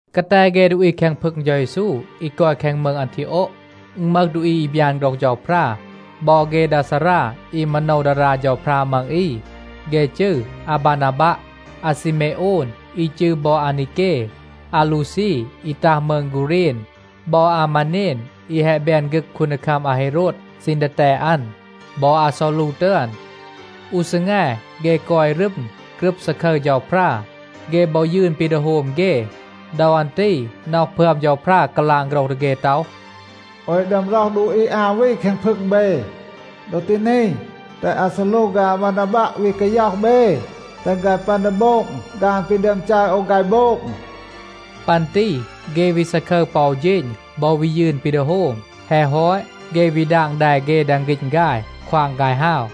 กาแต เฆ ดูอี แคง พึง เฌา เยซู อี กอย แคง มืง อันทีโอะ, อึณ มึห ดูอี อี บยาน โฆรห เฌาพรา บอ เฆ ดา ซารา อี มาโนว ดารา เฌาพรา มัง อี, เฆ จืร อาบานาบัะ, อาซีเมโอน อี จืร บอ อานีเก, อาลูซี อี ตัห มืง กูเรณ, บอ อามาเนน อี แฮะ แบน ฆึก คูนดีคัม อาเฮโรด ซีณ ดีแตด อัน, บอ อาซอลู ตึอน. อู ซีแง, เฆ กอย รึม, กรึบ ซาคึร เฌาพรา. เฆ บอ ยืน ปี ดี โฮม เฆ. ดอ อัน ตี น็อห พึอม เฌาพรา กาลาง โฆรห ดี เฆ ต็อห, “โอว แฮะ ดึอม ร็อห ดูอี อา วี แคง พึง เบ. ดอ ตี นี, แตห อาซอลู ฆาย อาบานาบัะ วี กาย็อห เบ, แตห ฆาย ปึอน ดี โบง ฆาน ปี ดึอม จัร โอว ฆาย โบง.” ปัน ตี เฆ วี ซาคึร ปอ อู เฌณ บอ วี ยืน ปี ดี โฮม. แฮะ ฮอต, เฆ วี ดาง แด เฆ แดง ฆีณ ฆาย, ควาง ฆาย ฮาว.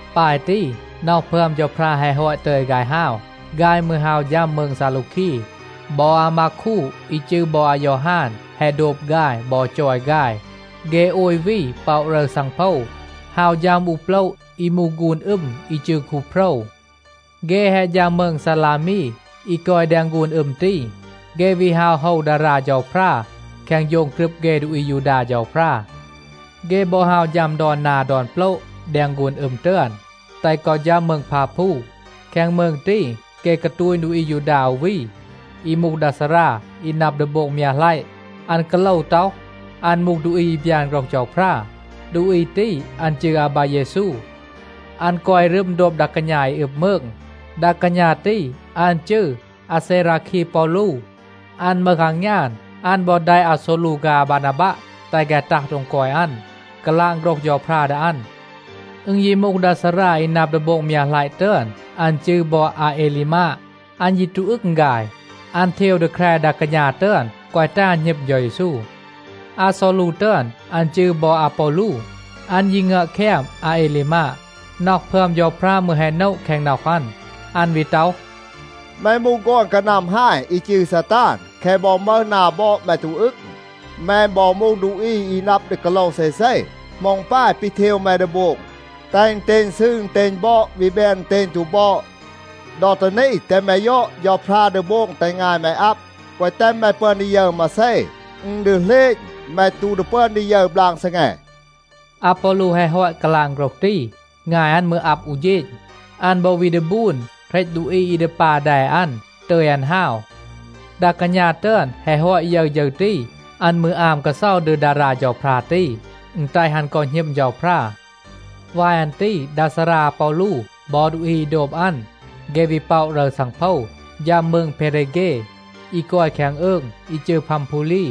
ปาย ตี, น็อห พึอม เฌาพรา แฮะ ฮอต ตึย ฆาย ฮาว, ฆาย มืร ฮาว ฌัม มืง ซาลูคี. บอ อามากู อี จืร บอ อายอฮาน แฮะ โดบ ฆาย บอ จอย ฆาย. เฆ โอย วี ป็อะ รึร ซังโพว, ฮาว ฌัม อู โปละ อี มูห ฆูน อึม อี จืร คูโพรว. เฆ แฮะ ฌัม มืง ซาลามี, อี กอย แดง ฆูน อึม ตี, เฆ วี ฮาว โฮว ดารา เฌาพรา แคง โฌง กรึบ เฆ ดูอี อายูดา เฌาพรา. เฆ บอ ฮาว ฌัม ดอน นา ดอน โปละ แดง ฆูน อึม ตึอน, แตห กอ ฌัม มืง พาพู. แคง มืง ตี, เฆ กาตูณ ดูอี อายูดา อู วี, อี มูห ดา ซารา อี นับ ดี โบง มยัะหลัยะ. อัน กาโลว ต็อห, อัน มูห ดูอี อี บยาน โฆรห เฌาพรา. ดูอี ตี, อัน จืร อาบาเยซู. อัน กอย รึม โดบ ดา กาณา อี อึบ มืง. ดา กาณา ตี, อัน จืร อาเซราคี ปอลู. อัน มึห อางยาน. อัน บอ แดะ อาซอลู ฆาย อาบานาบัะ, แตห ฆาย ตัห โดง กอย อัน, กาลาง โฆรห เฌาพรา ดี อัน. อึณ ยี มูห ดา ซารา อี นับ ดี โบง มยัะหลัยะ ตึอน. อัน จืร บอ อาเอลีมาด. อัน ยี ตู อึง ฆาย. อัน เทว ดี แคร ดา กาณา ตึอน, แกวะ แตห อัน หณึม เฌา เยซู. อาซอลู ตึอน, อัน จืร บอ อาปอลู, อัน ยี งึอบ แคม อาเอลีมาด. น็อห พึอม เฌาพรา มืร แฮะ โนะ แคง น็อห อัน. อัน วี ต็อห, “แม มูห ฆอน กานัม ฮาย, อี จืร ซาตาน. แคะ บอ มึห นา บอด, แม ตู อึง. แม บอ มูห ดูอี อี นับ ดี กาโลว เซเซ. เหมา อึณ ปาย ปี เทว แม ดี โบง, แตห อึณเตณ ซืร, อึณเตณ บอด วี แบน อึณเตณ ตู บอด. ดอ ตี นี, แตห แม ยอด, เฌาพรา ดี โบง แตห งาย แม อับ, แกวะ แตห แม ปึอน ดี ยึร มาเซ. อึณ ดี เหลณ, แม ตู ดี ปึอน ยึร บลาง ซีแง.” อาปอลู แฮะ ฮอต กาลาง โฆรห ตี, งาย อัน มืร อับ อู เฌณ. อัน บอ วีน ดี บูน, เหรต ดูอี อี ดี ปา แด อัน, ตึย อัน ฮาว. ดา กาณา ตึอน แฮะ ฮอต ยึร ฌึร ตี, อัน มืร อาม กาเซา ดี ดารา เฌาพรา ตี, อึณ แตห อัน กอ หณึม เฌาพรา. วาย อัน ตี ดา ซารา อาปอลู บอ ดูอี อี โดบ อัน, เฆ วี ป็อะ รึร ซังโพว, ฌัม มืง เพเรเฆ, อี กอย แคง อืง อี จืร พัมพูลี.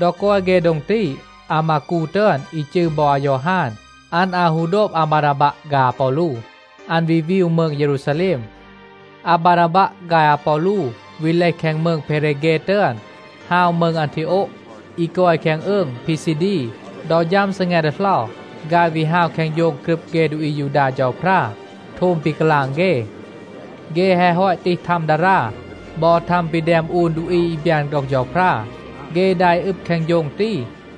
ดอ กอย เฆ โดง ตี, อามากู ตึอน อี จืร บอ อายอฮาน, อัน อาว ฮู โดบ อาบานาบัะ ฆาย อาปอลู. อัน วี วีว มืง เยรูซาแลม. อาบานาบัะ ฆาย อาปอลู วี เลห แคง มืง เพเรเฆ ตึอน, ฮาว มืง อันทีโอะ อี กอย แคง อืง พีซีดี. ดอ ฌัม ซีแง ดีเหลา, ฆาย วี ฮาว แคง โฌง กรึบ เฆ ดูอี อายูดา เฌาพรา, โทม ปี กาลาง เฆ. เฆ แฮะ ฮอต ตีห ทัม ดารา บอ ทัม ปี แดม อูน ดูอี อี บยาน โฆรห เฌาพรา, เฆ ดา อี อึบ แคง โฌง ตี,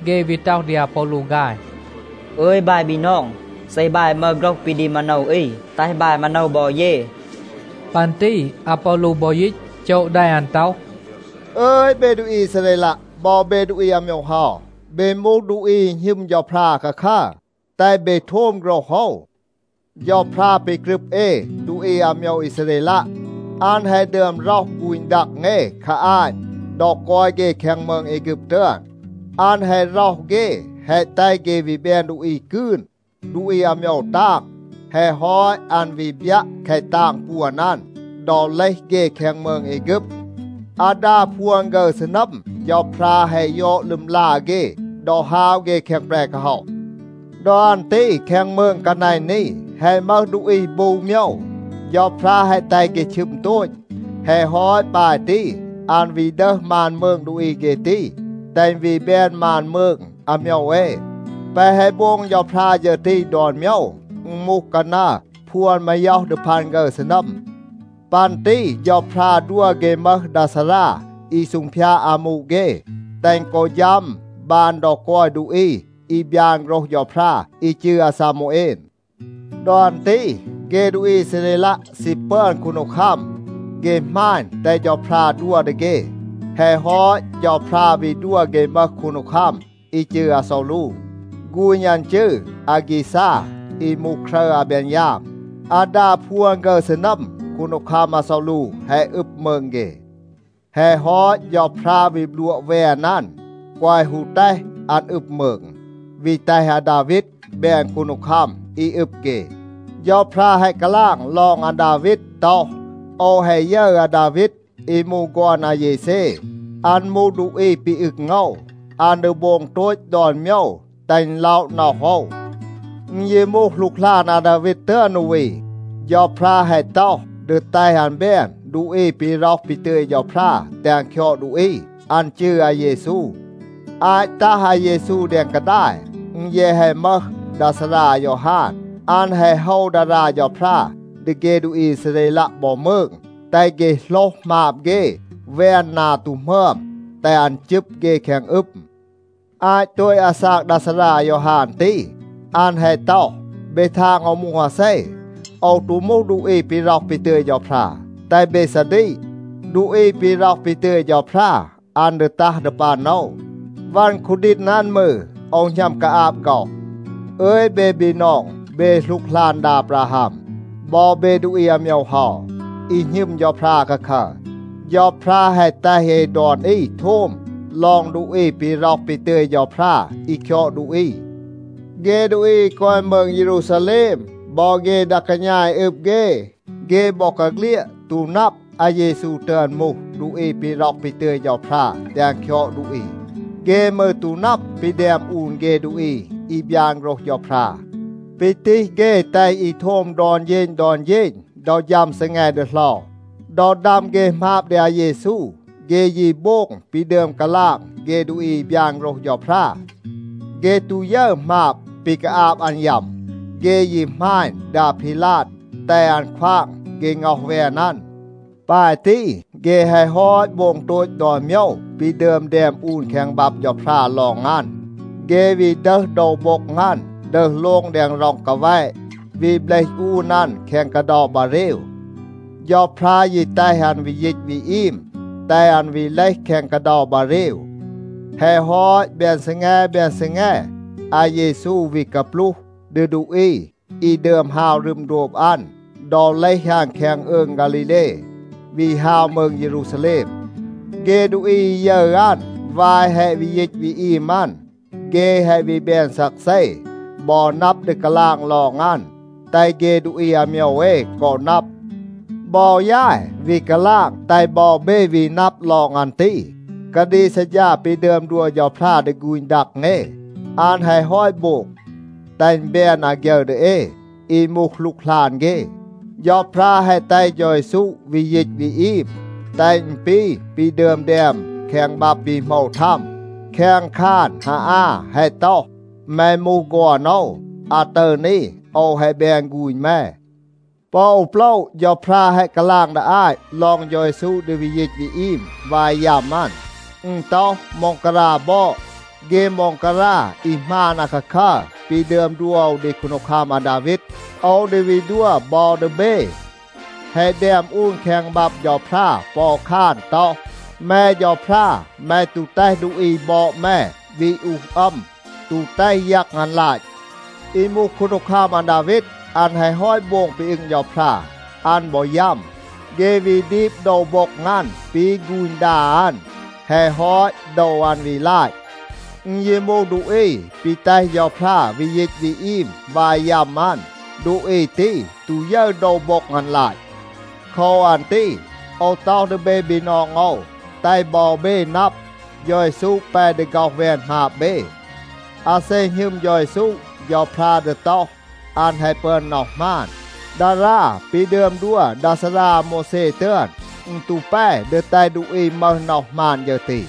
เฆ วี ต็อห ดี อาปอลู ฆาย, “อึย บาย บีนอง, เซ บาย มึห โฆรห ปี ดี มาโนว อี, แตห บาย มาโนว บอ เย.” ปัน ตี อาปอลู บอ ยีต, โจะ แด อัน ต็อห, “อึย เบ ดูอี อีซาเรลัะ บอ เบ ดูอี อาโมยว เฮา, เบ มูห ดูอี อี หณึม เฌาพรา อาคาคัร. แตห เบ โทม โฆรห โอว. เฌาพรา ปี กรึบ เอ ดูอี อาโมยว อีซาเรลัะ, อัน แฮะ ดึอม ร็อห ฆูณ ดัง เอ คา อาต. ดอ กอย เฆ แคง มืง แอฆึบ ตึอน, อัน แฮะ ร็อห เฆ, แฮะ แตห เฆ วี แบน ดูอี กืน, ดูอี อาโมยว ตาง. แฮะ ฮอต, อัน วี บยัะ แคะ ตาง ปวน อัน, ดอ เลห เฆ แคง มืง แอฆึบ. อาดา พวน ฆึร ซีนัม เฌาพรา แฮะ ยอด ลึมลา เฆ ดอ ฮาว เฆ แคง แปร กาฮ็อห. ดอ อัน ตี แคง มืง กานัณ นี, แฮะ มึห ดูอี บู โมยว. เฌาพรา แฮะ แตห เฆ ชึม โตต. แฮะ ฮอต ปาย ตี, อัน วี ดึห มาน มืง ดูอี เฆ ตี, แตห อึณ วี แบน มาน มืง อาโมยว เอ. แปะ แฮะ โบง เฌาพรา ฌึร ตี ดอน โมยว, อึณ มูห กานัร พวน มาย็อห ดี พัน ฆึร ซีนัม. ปัน ตี เฌาพรา ดัว เฆ มึห ดา ซารา อี ซูงพยาด อามู เฆ, แตห อึณ กอ ฌัม บาน ดอ กอย ดูอี อี บยาน โฆรห เฌาพรา, อี จืร อาซามูเอน. ดอ อัน ตี เฆ ดูอี อีซาเรลัะ ซี ปึอน คูนดีคัม. เฆ หมาณ, แตห เฌาพรา ดัว ดี เฆ. แฮะ ฮอต, เฌาพรา วี ดัว เฆ มึห คูนดีคัม อี จืร อาซอลู. ฆูณ อัน จืร อากีซา, อี มูห ครึร อาเบนยาม. อาดา พวน ฆึร ซีนัม คูนดีคัม อาซอลู แฮะ อึบ มืง เฆ. แฮะ ฮอต, เฌาพรา วี บลัวะ แวน อัน, แกวะ ฮู แตห อัน อึบ มืง, วี แตห อาดาวีด แบน คูนดีคัม อี อึบ เฆ. เฌาพรา แฮะ กาลาง ลอง อาดาวีด ต็อห, ‘โอว แฮะ ยึร อาดาวีด อี มูห ฆอน อาเยเซ. อัน มูห ดูอี ปี อึง โอว. อัน ดี โบง โตต ดอน โมยว, แตห อึณ ล็อะ น็อห โอว.’ อึณ ยี มูห หลูกหลาน อาดาวีด ตึอน อู วี. เฌาพรา แฮะ ต็อห ดี แตห อัน แบน ดูอี ปี ร็อห ปี ตึย เฌาพรา แตห อัน คยอด ดูอี. อัน จืร อาเยซู. อาต ตัห อาเยซู แดง กาดาย, อึณ แยะ แฮะ มึห ดา ซารา อายอฮาน. อัน แฮะ โฮว ดารา เฌาพรา ดี เฆ ดูอี อีซาเรลัะ บอ มืง, แตห เฆ โหลห หมาบ เฆ, แวน นา ตู หมึอม, แตห อัน จึบ เฆ แคง อึม. อาต โตต อาซาก ดา ซารา อายอฮาน ตี, อัน แฮะ ต็อห, ‘เบ ทาง โอว มูห อาเซ? โอว ตู มูห ดูอี ปี ร็อห ปี ตึย เฌาพรา. แตห เบ ซาดีก. ดูอี ปี ร็อห ปี ตึย เฌาพรา, อัน ดี ตัห ดี ปัน โอว. วัน คูดีณ อัน มืร, โอว หณัม กาอาบ ฆ็อห.’ อึย เบ บีนอง, เบ หลูกหลาน ดา อาบราฮัม, บอ เบ ดูอี อาโมยว เฮา, อี หณึม เฌาพรา อาคาคัร, เฌาพรา แฮะ แตห เอ ดอน อี โทม ลอง ดูอี ปี ร็อห ปี ตึย เฌาพรา, อี คยอด ดูอี. เฆ ดูอี อี กอย มืง เยรูซาแลม บอ เฆ ดา กาณา อี อึบ เฆ, เฆ บอกาเฆลียด ตู นับ, อาเยซู ตึอน มูห ดูอี ปี ร็อห ปี ตึย เฌาพรา แตห อัน คยอด ดูอี. เฆ มืร ตู นับ ปี แดม อูน เฆ ดูอี อี บยาน โฆรห เฌาพรา, ปี ตีห เฆ แตห อี โทม ดอน เฌณ ดอน เฌณ ดอ ฌัม ซีแง ดีเหลา. ดอ ดัม เฆ หมาบ ดี อาเยซู, เฆ ยี โบง ปี ดึอม กาลาง เฆ ดูอี อี บยาน โฆรห เฌาพรา. เฆ ตู ยึร หมาบ ปี กาอาบ อัน ยัม. เฆ ยี หมาณ ดี อาพีลาด, แตห อัน ควาง เฆ ง็อห แวน อัน. ปาย ตี, เฆ แฮะ ฮอต โบง โตต ดอน โมยว ปี ดึอม แดม อูน แคง บับ เฌาพรา ลอง อัน. เฆ วี ดึห โดว โบ็ง อัน, ดึห โลง แดง ร็อง กาแวะ, วี เบลห อูน อัน แคง กาเดา บาเรว. เฌาพรา ยี แตห อัน วี ยีต วี อีม, แตห อัน วี เลห แคง กาเดา บาเรว. แฮะ ฮอต, แบน ซีแง แบน ซีแง, อาเยซู วี กาปลูห ดี ดูอี อี ดึอม ฮาว รึม โดบ อัน, ดอ เลห อัน แคง อืง ฆาลีเล, วี ฮาว มืง เยรูซาแลม. เฆ ดูอี อี ยึร อัน วาย แฮะ วี ยีต วี อีม อัน, เฆ แฮะ วี แบน ซักเซ, บอ นับ ดี กาลาง ลอง อัน, แตห เฆ ดูอี อาโมยว เอ กอ นับ. บอ ยาย วี กาลาง, แตห บอ เบ วี นับ ลอง อัน ตี. กาดีก ซัดฌา ปี ดึอม ดัว เฌาพรา ดี ฆูณ ดัง เอ, อัน แฮะ ฮอต โบง, แตห อึณ แบน อาฆยึร ดี เอ, อี มูห หลูกหลาน เฆ. เฌาพรา แฮะ แตห เฌา เยซู วี ยีต วี อีม, แตห อึณ ปี ปี ดึอม แดม แคง บับ ปี โหมว ทัม. แคง คาน ฮาอา แฮะ ต็อห, ‘แม มูห ฆอน โอว. อาตึร นี โอว แฮะ แบน ฆูณ แม.’ ปอ อู โปละ เฌาพรา แฮะ กาลาง ดี อาต ลอง เฌา เยซู ดี วี ยีต วี อีม วาย ยัม อัน. อึณ ต็อห, ‘ม็องการา บอด, เฆ ม็องการา อี หมาน อาคาคัร, ปี ดึอม ดัว โอว ดี คูนดีคัม อาดาวีด, โอว ดี วี ดัว บอ ดี เบ.’ แฮะ แดม อูน แคง บับ เฌาพรา ปอ อู คาน ต็อห, ‘แม เฌาพรา, แม ตู แตห ดูอี บอด แม วี อูห อัม, ตู แตห ยัง อัน ลาต.’ อี มูห คูนดีคัม อาดาวีด, อัน แฮะ ฮอต โบง ปี อึง เฌาพรา, อัน บอ ยัม. เฆ วี ดีบ โดว โบ็ง อัน ปี ฆูณ ดา อัน. แฮะ ฮอต, โดว อัน วี ลาต. อึณ ยี มูห ดูอี ปี แตห เฌาพรา วี ยีต วี อีม วาย ยัม อัน, ดูอี ตี ตู ยึร โดว โบ็ง อัน ลาต. โคว อัน ตี โอว ต็อห ดี เบ บีนอง โอว, แตห บอ เบ นับ, เฌา เยซู แป ดี ฆ็อห แวน หมาบ เบ. อาเซ หณึม เฌา เยซู, เฌาพรา ดี ต็อห, อัน แฮะ ปึอน น็อห หมาน. ดารา ปี ดึอม ดัว ดา ซารา อาโมวแซ ตึอน, อึณ ตู แป ดี แตห ดูอี มึห น็อห หมาน ฌึร ตี.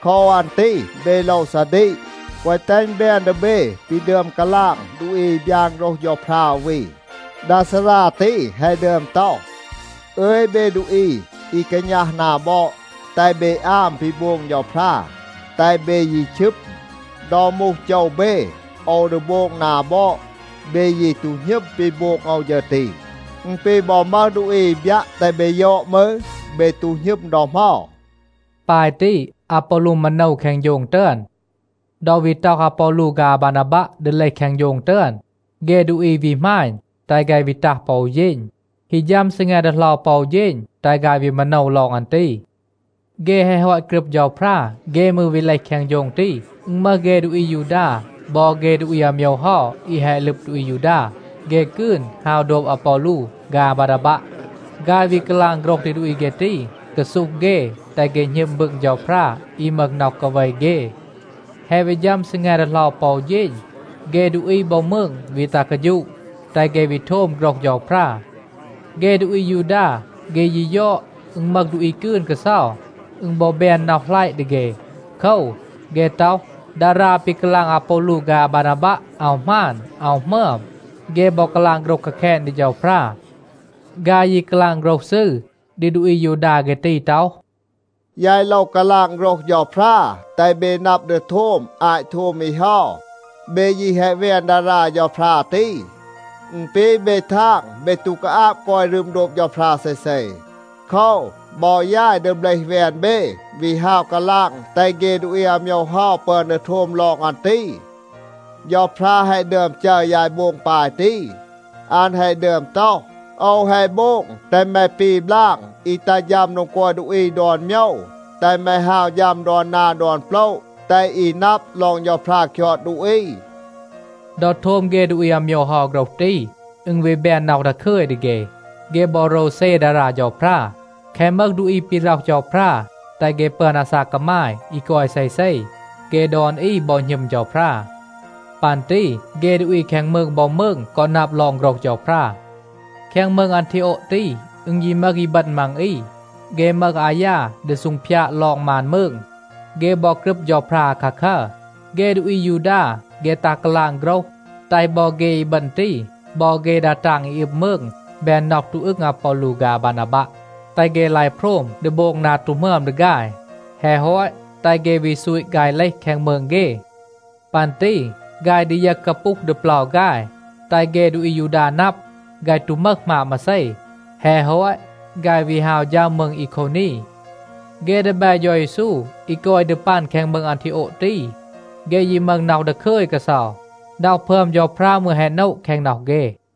โคว อัน ตี เบ โลว ซาดีก, แกวะ แตห อึณ แบน ดี เบ ปี ดึอม กาลาง ดูอี อี บยาน โฆรห เฌาพรา อู วี. ดา ซารา ตี แฮะ ดึอม ต็อห, ‘อึย เบ ดูอี อี กาณัห นา บอด, แตห เบ อาม ปี โบง เฌาพรา, แตห เบ ยี ชึม. ดอ มูห โจว เบ, โอว ดี โบง นา บอด. เบ ยี ตู หณึม ปี โบง โอว ฌึร ตี. อึณ ปี บอ มึห ดูอี อี บยัะ แตห เบ ยอด มืร, เบ ตู หณึม ดอ เหมา.’” ปาย ตี อาปอลู มาโนว แคง โฌง ตึอน. ดอ วี ต็อห อาปอลู ฆาย อาบานาบัะ ดี เลห แคง โฌง ตึอน, เฆ ดูอี วี หมาณ, แตห ฆาย วี ตัห ปอ อู เฌณ. ฮี ฌัม ซีแง ดีเหลา ปอ อู เฌณ, แตห ฆาย วี มาโนว ลอง อัน ตี. เฆ แฮะ ฮอต กรึบ เฌาพรา, เฆ มืร วี เลห แคง โฌง ตี. อึณ มึห เฆ ดูอี อายูดา บอ เฆ ดูอี อาโมยว เฮา อี แฮะ ลึบ ดูอี อายูดา, เฆ กืน ฮาว โดบ อาปอลู ฆาย อาบานาบัะ. ฆาย วี กาลาง โฆรห ดี ดูอี เฆ ตี, กาซูห เฆ, แตห เฆ หณึม บึง เฌาพรา อี มึห น็อห กาเว เฆ. แฮะ วี ฌัม ซีแง ดีเหลา ปอ อู เฌณ, เฆ ดูอี บอ มืง วี ตัห กาฌูะ, แตห เฆ วี โทม โฆรห เฌาพรา. เฆ ดูอี อายูดา, เฆ ยี ยอด, อึณ มึห ดูอี กืน กาเซา, อึณ บอ แบน น็อห หลัยะ ดี เฆ. โคว, เฆ ต็อห, ดารา ปี กาลาง อาปอลู ฆาย อาบานาบัะ, อาว หมาน, อาว หมึอม. เฆ บอ กาลาง โฆรห กาแคณ ดี เฌาพรา. ฆาย ยี กาลาง โฆรห ซืร ดี ดูอี อายูดา เฆ ตี ต็อห, “ยาย โลว กาลาง โฆรห เฌาพรา, แตห เบ นับ ดี โทม อาต โทม อี เฮา. เบ ยี แฮะ แวน ดารา เฌาพรา ตี. อึณ ปี เบ ทาง เบ ตู กาอาบ กอย รึม โดบ เฌาพรา เซเซ. โคว, บอ ยาย ดี เบลห แวน เบ, วี ฮาว กาลาง แตห เฆ ดูอี อาโมยว เฮา ปึอน ดี โทม ลอง อัน ตี. เฌาพรา แฮะ ดึอม จัร ยาย โบง ปาย ตี. อัน แฮะ ดึอม ต็อห, ‘โอว แฮะ โบง แตห แม ปี บลาง อี ตัห ฌัม โดง กอย ดูอี ดอน โมยว, แตห แม ฮาว ฌัม ดอน นา ดอน โปละ, แตห อี นับ ลอง เฌาพรา คยอด ดูอี.’” ดอ โทม เฆ ดูอี อาโมยว เฮา โฆรห ตี, อึณ วี แบน น็อห ดาคึย ดี เฆ. เฆ บอ โรวเซ ดารา เฌาพรา. แคะ มึห ดูอี ปี ร็อห เฌาพรา, แตห เฆ ปึอน อาซาก กามาย อี กอย เซเซ, เฆ ดอน อี บอ หณึม เฌาพรา. ปัน ตี เฆ ดูอี แคง มืง บอ มืง กอ นับ ลอง โฆรห เฌาพรา. แคง มืง อันทีโอะ ตี, อึณ ยี มึห อีบึณ มัง อี, เฆ มึห อายา ดี ซูงพยาด ลอง มาน มืง. เฆ บอ กรึบ เฌาพรา อาคาคัร. เฆ ดูอี อายูดา, เฆ ตัห กาลาง โฆรห, แตห บอ เฆ อีบึณ ตี บอ เฆ ดา ตาง อี อึบ มืง แบน น็อห ตู อึง อาปอลู ฆาย อาบานาบัะ, แตห เฆ ลาย โพรม ดี โบง นา ตู หมึอม ดี ฆาย. แฮะ ฮอต, แตห เฆ วี ซูต ฆาย เลห แคง มืง เฆ. ปัน ตี ฆาย ดียึห กาปูห ดี เปลา ฆาย, แตห เฆ ดูอี อายูดา นับ, ฆาย ตู มึห หมาบ มาเซ. แฮะ ฮอต, ฆาย วี ฮาว ฌัม มืง อีโควนี. เฆ ดีแบ เฌา เยซู อี กอย ดี ปัน แคง มืง อันทีโอะ ตี, เฆ ยี มึห น็อห ดาคึย กาเซา. น็อห พึอม เฌาพรา มืร แฮะ โนะ แคง น็อห เฆ.